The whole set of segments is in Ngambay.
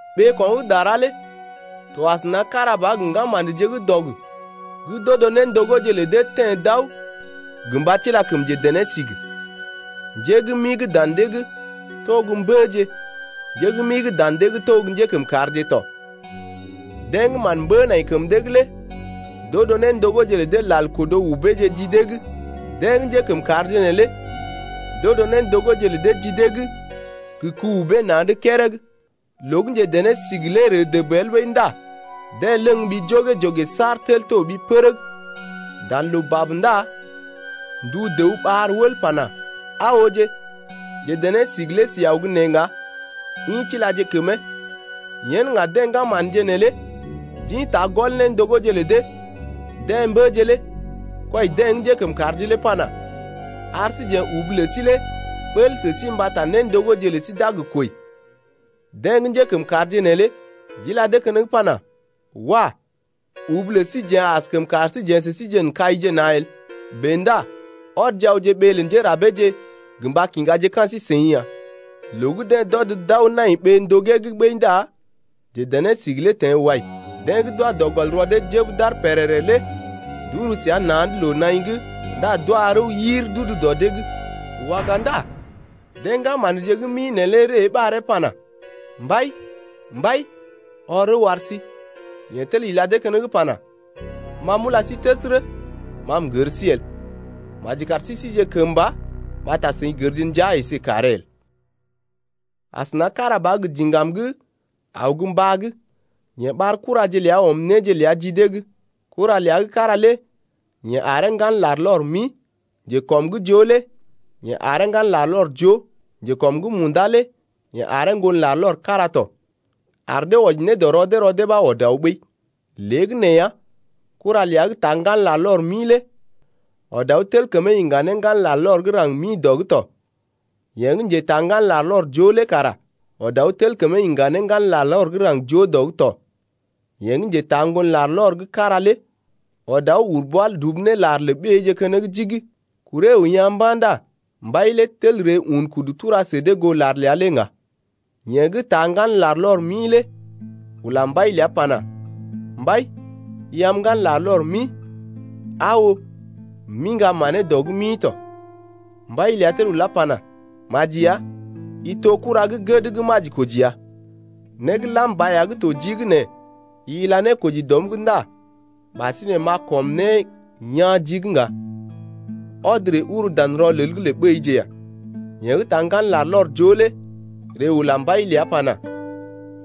Ɓeeko̰ gə́ dara lé to asəna kára ba gə ŋgama̰dje gə́ dɔg gə́ d’odo néndogóje lə dee teḛ d’aw gə mba tila kəm njedené-sigi. Njé gə́ mi gə́ dan dee’g to gə́ mbəje, njé gə́ mi gə́ dan dee’g to gə́ njékəmkàrje tɔ. Deḛ gə́ mán mbə nai kəm dee’g lé d’odo néndogóje lə dee lal kodo ubeeje ji dee’g. Deḛ gə́ njékəmkàrje neelé d’odo néndogóje lə dee ji dee’g gə ku-ubee na̰’d kérég. Loo gə́ njedené-sigi lé ree dəb el ɓəi ndá deḛ ləŋg ɓi jogè-jogè saar tel toɓi pərəg. Dan loo bab ndá ndu dəw ɓar wəl pana: Aa ooje, njedené-sigi lé si aw gə́ nee ŋga, ḭ tilaje kəmee. Yen ŋga deḛ ŋgama̰dje neelé d’ḭta gɔl néndogóje lə dee. Deḛ mbəje lé kwɔi deḛ gə́ njékəmkàrje lé pana: Ar síjeḛ ubu lə sí lé bəl sə sí mbata néndogóje lə sí d’a gə kwəi. Deḛ gə́ njékəmkàrje neelé d’ila dee keneŋ pana: Wah! Ubu lə síjeḛ askəm kar sí jeḛ sə síje n’kaije na̰ el. Bèe ndá ɔdje awje ɓee lə njérabeeje gə mba kiŋgaje ka̰ sí-seḭ ya. Loo gə́ deḛ d’ɔd d’aw nai ɓee ndogee’g ɓəi ndá njedené-sigi lé teḛ wai. Deḛ gə́ d’wa dɔ gɔl rɔ dee jəb d’aar pèrèrè lé d’uru səa na̰’d loo-naḭ’g ndá d’wa rəw yir d’udu dɔ dee’g. Waga ndá deḛ ŋgama̰dje gə́ mi neelé ree ɓaree pana: Mbai, mbai, ɔr rəw ar sí. Yeḛ tel ila dee keneŋ pana: Ma m’ula sí təsərə, ma m’gər sí el. Maji kar sí síje kəmba mbata seḭ gərje ndəa əsé kàree el. Asəna kára ba gə diŋgam gə́ aw gə́ mbá’g, yeḛ ɓar kuraje ləa ɔm néje ləa ji dee’g. Kura ləa gə́ kára lé yeḛ aree ŋgan larlɔr mi, njekɔm’g joo lé yeḛ aree ŋgan larlɔr joo, njekɔm’g munda lé yeḛ aree ŋgon larlɔr kára tɔ, ar dee wɔji ne dɔ rɔ dee rɔ dee ɓa ɔd aw ɓəi. Léegəneeya kura ləa gə́ taa ŋgan larlɔr mi lé ɔd aw tel kəmee iŋga ne ŋgan larlɔr gə́ raŋg mi dɔ’g tɔ. Yeḛ gə́ njetaa ŋgan larlɔr joo lé kara ɔd aw tel kəmee iŋga ne ŋgan larlɔr gə́ raŋg joo dɔ’g tɔ. Yeḛ gə́ njetaa ŋgon larlɔr gə́ kára lé ɔd aw uru bwa dubu ne lar lə ɓéeje keneŋ jigi. Kuree əw yaa̰ mba̰ ndá mbai lé tel ree un kudu tura sə dee goo lar ləa lé ŋga. Yeḛ gə́ taa ŋgan larlɔr mi lé ula mbai ləa pana: Mbai, i am ŋgan larlɔr mi. Aa oo, m’iŋga manee dɔ’g mi tɔ. Mbai ləa tel ulá pana: Maji ya, i to kura gə́ gəd gə́ majikoji ya. Né gə́ lam ba ya gə́ to jii’g nɛ i ila ne koji dɔm’g ndá ɓasinè m’a kɔm né yaa̰ jii’g ŋga. Ɔd ree uru dan rɔlel’g lə ɓéije ya. Yeḛ gə́ taa ŋgan larlɔr joo lé ree ula mbai ləa pana: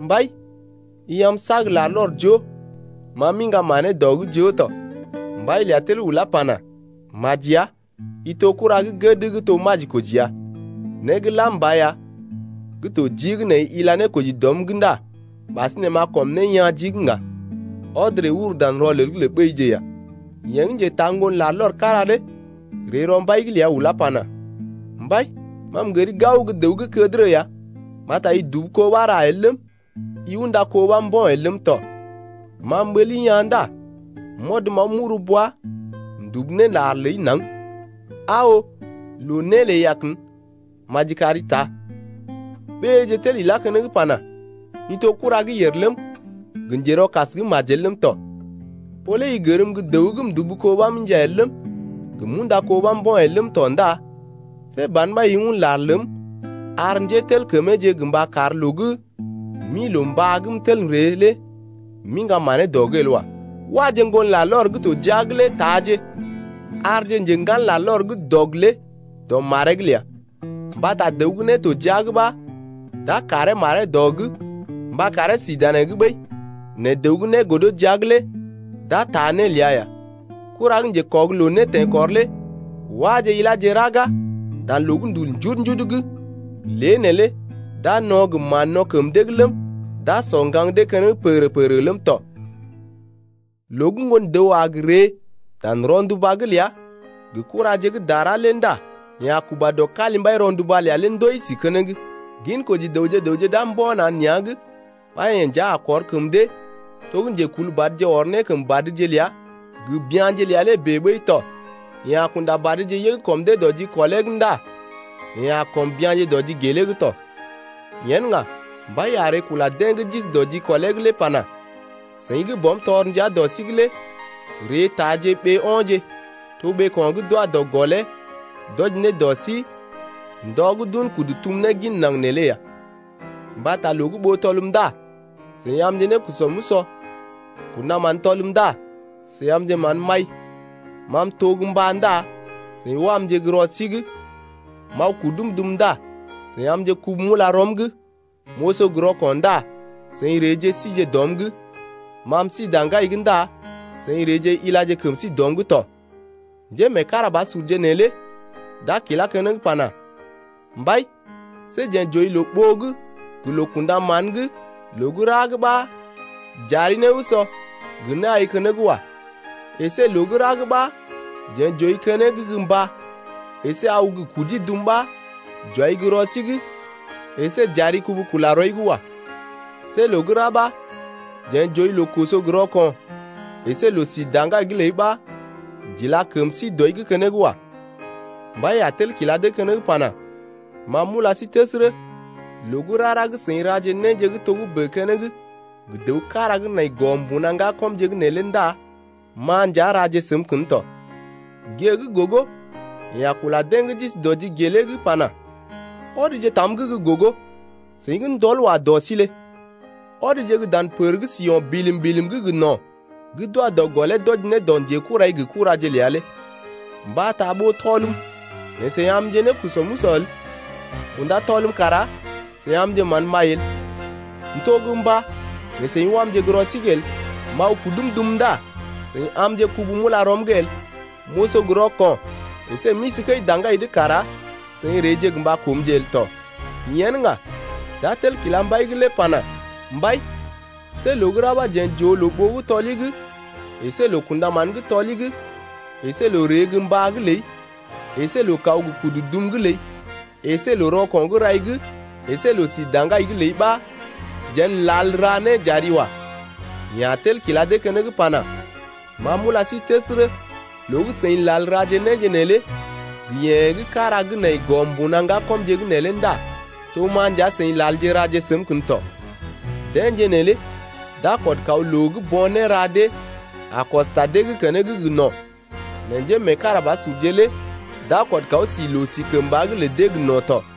Mbai, i am sag larlɔr joo, ma m’iŋga manee dɔ’g joo tɔ. Mbai ləa tel ulá pana, Maji ya, i to kura gə́ gəd gə́ to majikoji ya. Né gə́ lam ba ya gə́ to jii’g nɛ i ila ne koji dɔm’g ndá ɓasinè m’a kɔm né yaa̰ jii’g ŋga. Ɔd ree uru dan rɔlel’g lə ɓéije ya. Yeḛ gə́ njetaa ŋgon larlɔr gə́ kára lé ree rɔ mbai’g ləa ulá pana: Mbai, ma m’gəri gao gə́ dəw gə́ kədərə ya mbata i dubu kó ɓa ra el ləm, i unda kó ɓa mbo̰ el ləm tɔ. Ma m’ɓəli yaa̰ ndá m’ɔd m’aw m’uru bwa m’dubu ne lar ləi naŋg. Aa oo loo né ləi ya kən, maji kari taa. Ɓéeje lé tel ilá keneŋ pana: I to kura gə́ yèr ləm, gə njerɔkas gə́ majel ləm tɔ. Ɓó lé i gərm gə́ dəw gə́ m’dubu kó ɓa m’inja el ləm, gə m’unda kó ɓa mbo̰ el ləm tɔ ndá see ban ɓa i un lar ləm ar njételkəmeeje gə mba kar loo gə́ m’ḭ loo-mbá’g m’tel m’ree lé m’iŋga manee dɔ’g el wa. Waje ŋgon larlɔr gə́ to jia’g lé taaje arje njḛgan larlɔr gə́ dɔg lé dɔ maree’g ləa, Mbata dəw gə́ né to jia’g ɓa d’a karee maree dɔ’g mba karee sí danee’g ɓəi, nɛ dəw gə́ né godo jia’g lé d’a taa né ləa ya. Kura gə́ njekɔg loo né teḛkɔr lé wáje iláje raga dan loo gə́ ndul njudu-njudu’g, lé neelé d’a no̰ gə mán-no̰ kəm dee’g ləm, d’a sɔ ŋgaŋ dee keneŋ pəgərə-pəgərə ləm tɔ. Loo gə́ Ŋgon-dəw a gə ree dan rɔnduba’g ləa gə kuraje gə́ dara lé ndá yeḛ a kuba dɔ kalimbai rɔnduba’g ləa lé ndoi si keneŋ. Ginkoji dəwje gə raŋg d’a mbo̰ na̰ nea̰’g ɓa yeḛ nja a kɔr kəm dee to gə́ njekulbadje ɔr ne kəm badje ləa gə bya̰je ləa lé bèe ɓəi tɔ. Yeḛ a kunda badje yəg kɔm dee dɔ jikɔlee’g ndá yeḛ a kɔm bya̰je dɔ jigelee’g tɔ. Yen ŋga, mbai a ree kula deḛ gə́ d’isi dɔ jikɔlee’g lé pana: Seḭ gə́ Bɔm tɔr ndia dɔ sí’g lé ree taaje ɓee o̰je, to ɓeeko̰ gə́ d’wa dɔ gɔlee d’wɔji ne dɔ sí ndɔ gə́ d’un kudu tum ne gin naŋg neelé ya. Mbata loo gə́ ɓó tɔlm ndá seḭ amje nékusɔ m’usɔ, kṵdaman tɔlm ndá seḭ amje mán m’ai, ma m’to gə́ mbá ndá seḭ wamje gə́ rɔ sí’g, m’aw kudum dum ndá seḭ amje kubu m’ula rɔm’g, m’oso gə rɔko̰ ndá seḭ reeje sije dɔm’g, ma m’isi daŋgai’g ndá seḭ reeje ilaje kəm sí dɔm’g tɔ. Njémeekarabasurje neelé d’a kilá keneŋ pana: Mbai, see jeḛ j’ooi loo-ɓoo’g gə loo-kṵdaman’g loo gə́ ra’g ɓa j’ari né usɔ gə né ai keneŋ wa. Esé loo gə́ ra ɓa jeḛ j’ooi keneŋ gə́ mbá əsé aw gə kudi dum ɓa j’wai gə́ rɔ sí’g əsé j’ila kəm sí dɔi’g keneŋ wa. See loo gə́ ra ɓa jeḛ j’ooi loo koso gə rɔko̰ əsé loo-si daŋgai’g ləi ɓa j’ila kəm sí dɔi’g keneŋ wa. Mbai lé a tel kila dee keneŋ pana: Ma m’ula sí təsərə, loo gə́ rara gə́ seḭ raje néje gə́ togə́bè keneŋ gə dəw kára gə́ nai gɔ mbuna ŋgakɔmje’g neelé ndá ma nja raje səm kən tɔ. Gée gə́ gogo yeḛ a kula deḛ gə́ d’isi dɔ jigelee’g pana: Ɔdje tam’g gə́ gogo, seḭ gə́ ndɔl wa dɔ sí lé, ɔdje gə́ dan pər gə́ si o̰ bilim-bilim’g gə no̰ gə́ d’wa dɔ gɔlee d’wɔji ne dɔ njekurai gə kuraje ləa lé. Mbata ɓó tɔlm né seḭ amje nékusɔ m’usɔ el, kunda tɔlm kara seḭ amje mán m’ai el, m’to gə́ mbá nɛ seḭ wamje gə́ rɔ sí’g el, m’aw kudum dum ndá seḭ amje kubu m’ula rɔm’g el, m’oso gə rɔko̰ əsé m’isi kəi daŋgai’g kara seḭ reeje gə mba koomje el tɔ. Yen ŋga d’a tel kila mbai’g lé pana: Mbai, see loo gə́ ra ɓa jeḛ j’ooi loo-ɓoo gə́ tɔli’g əsé loo-kṵdaman gə́ tɔli’g, əsé loo ree gə mbá’g ləi, əsé loo kaw gə kudu dum’g ləi, əsé loo-rɔko̰ gə́ rɔi’g, əsé loo-si kəi-daŋgai’g ləi ɓa jeḛ n’lal ra né j’ari wa. Yeḛ a tel kila dee keneŋ pana: Ma m’ula sí təsərə, loo gə́ seḭ lal raje néje neelé gə yeḛ gə́ kára gə́ nai gɔ mbuna ŋgakɔmje’g neelé ndá to ma nja seḭ lalje raje səm kən tɔ. Deḛje neelé d’a kɔd kaw loo gə́ bo̰ néra dee a kɔs ta dee’g keneŋ gə no̰ nɛ njémeekarabasurje lé d’a kɔd kaw si loo-sikəmba’g lə dee gə no̰ tɔ.